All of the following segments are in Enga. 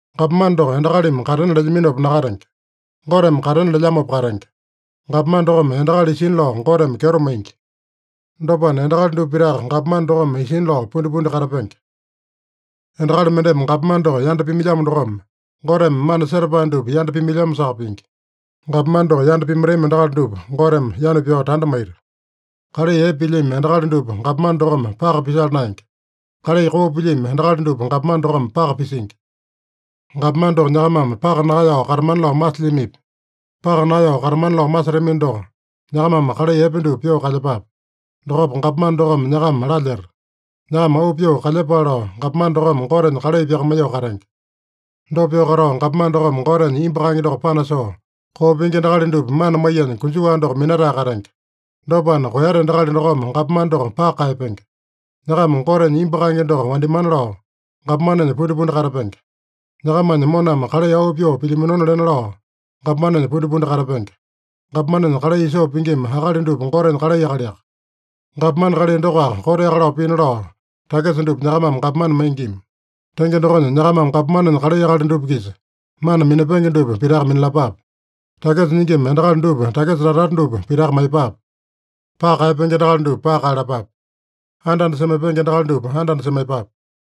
Gapomane doko endakalimi katena lelyaminopa nakatenge. Goteme katena lelyamopa katenge. Gapomane dokome endakali isina lao Goteme kyeto maingi. Dopana, endakali dupa pitaka gapomane dokome isina lao pundipundi katapenge. Endakali mendeme gapomane doko yanda pimailyamo dokome, Goteme mana setapae dupa yanda pimailyamosaka pingi. Gapomane doko yanda pimaitami endakali dupa Goteme yanu pyao tanda maita. Kalai epe pilyami endakali dupa gapomane dokome paka pisala naenge. Kalai koo pilyami endakali dupa gapomane dokome paka pisingi. Gapomane doko nyakamame paka nakaeyao katamana lao masilyamipi? Paka nakaeyao katamana lao masetamino doko, nyakamame kalai epe dupa pyoo kalyepape. Dokopa gapomane dokome nyakama lalyeta. Nyakama auu pyoo kalyepale lao gapomane dokome Gotenya kalai pyakamaiyoo katenge. Dopa pyoo katao, gapomane dokome Gotenya imbu kaenge doko panasoo, koo pingi endakali dupa mana maiyanya konjuwa doko minatae katenge. Dopana, koeyate endakali dokome gapomane doko paka kaeyapenge. Nyakama Gotenya imbu kaenge doko wandimana lao, gapomanenya pundipundi katapenge. Nyakamanya moname kalai auu pyoo pilyaminona lena lao gapomanenya pundipundi katapenge. Gapomanenya kalai isoo pingima akali dupa Gotenya kalai akaliaka. Gapomane kalai dokoaka koteaka lao pina lao, takisa dupa nyakamame gapomane maingima. Tenge dokonya, nyakamame gapomanenya kalai akali dupa-kisa mana minapenge dupa pitaka minalapape: Takisa nyingima endakali dupa takisa tata-tata dupa pitaka maiyepape. Paka kaeyapenge endakali dupa paka kaeyalapape. Anda-anda semaipenge endakali dupa anda-anda semaiyepape.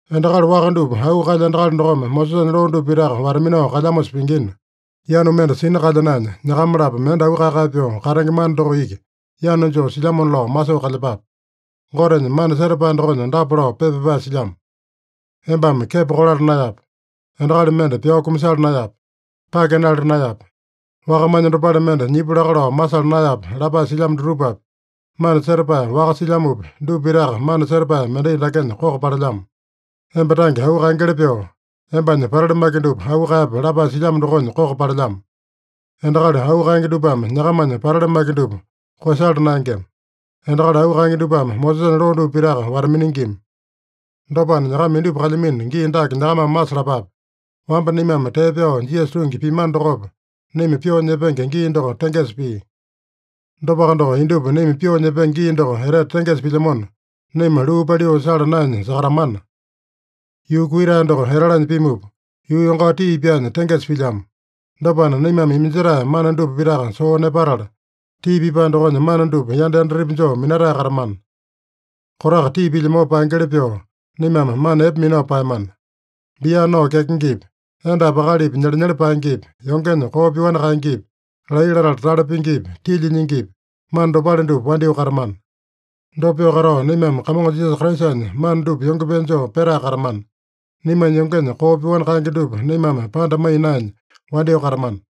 Endakali waka dupa auu kaelya endakali dokome Mosesanya loo dupa pitaka wata-minao kalyamosa pingina, yanu mende sina kalya naenya, nyakama-lapo mende auu kae-kae pyoo katenge mana doko iki yanu joo silyamona lao masoo kalyepape. Gotenya mana setapae dokonya dapa lao pepa pyapae silyamo: “Embame kepo kolala naeyape. Endakali mende pyao kumasala naeyape. Pake nala naeyape. Wakamanya dopale mende nyipu laka lao masala naeyape” lapae silyamo dutupapi, mana setapae waka silyamopi, dupa pitaka mana setapae mendai dakenya koko palelyamo: “Emba tange auu kaengeli pyoo, embanya patali maki dupa auu kaeyape” lapae silyamo dokonya koko palelyamo. Endakali auu kaenge dupame nyakamanya patali maki dupa koeyasala naengema. Endakali auu kaenge dupame Mosesanya loo dupa pitaka wata-miningima. Dopana, nyakama indupa kalyamino gii dake nyakamame masalapape. Wamba naimame tee pyao Jisasa tungi piamano dokopa, naima pyoo nyepenge gii doko tengesa pia. Dopaka doko, indupa naima pyoo nyepenge gii doko etete tengesa pilyamona, naima luu paliu sala naenya sakatamana. Yuu kuiyetae doko etalanya pimupa, yuu yongao tii pyaanya tengesa pilyamo. Dopana, naimame iminjetae mana dupa pitaka soo nepatala, tii pipae dokonya mana dupa yanda yandatepi joo minatae katamana. Kotaka tii pilyamopa paengeli pyoo, naimame mana epe minao paeyamana. Bia nao kyakengepi, endapi akalipi nyelenyele paengepi, yongenya koo pyoani kaengepi, laiya latala tale pingipi, tilya nyingipi, mana dopale dupa wandyoo katamana. Dopa pyoo katao, naimame Kamongo Jisasa Kraisanya mana dupa yonge pee joo petae katamana. Naimanya yongenya koo pyoani kaenge dupa naimame panda maiya naenya, wandyoo katamana.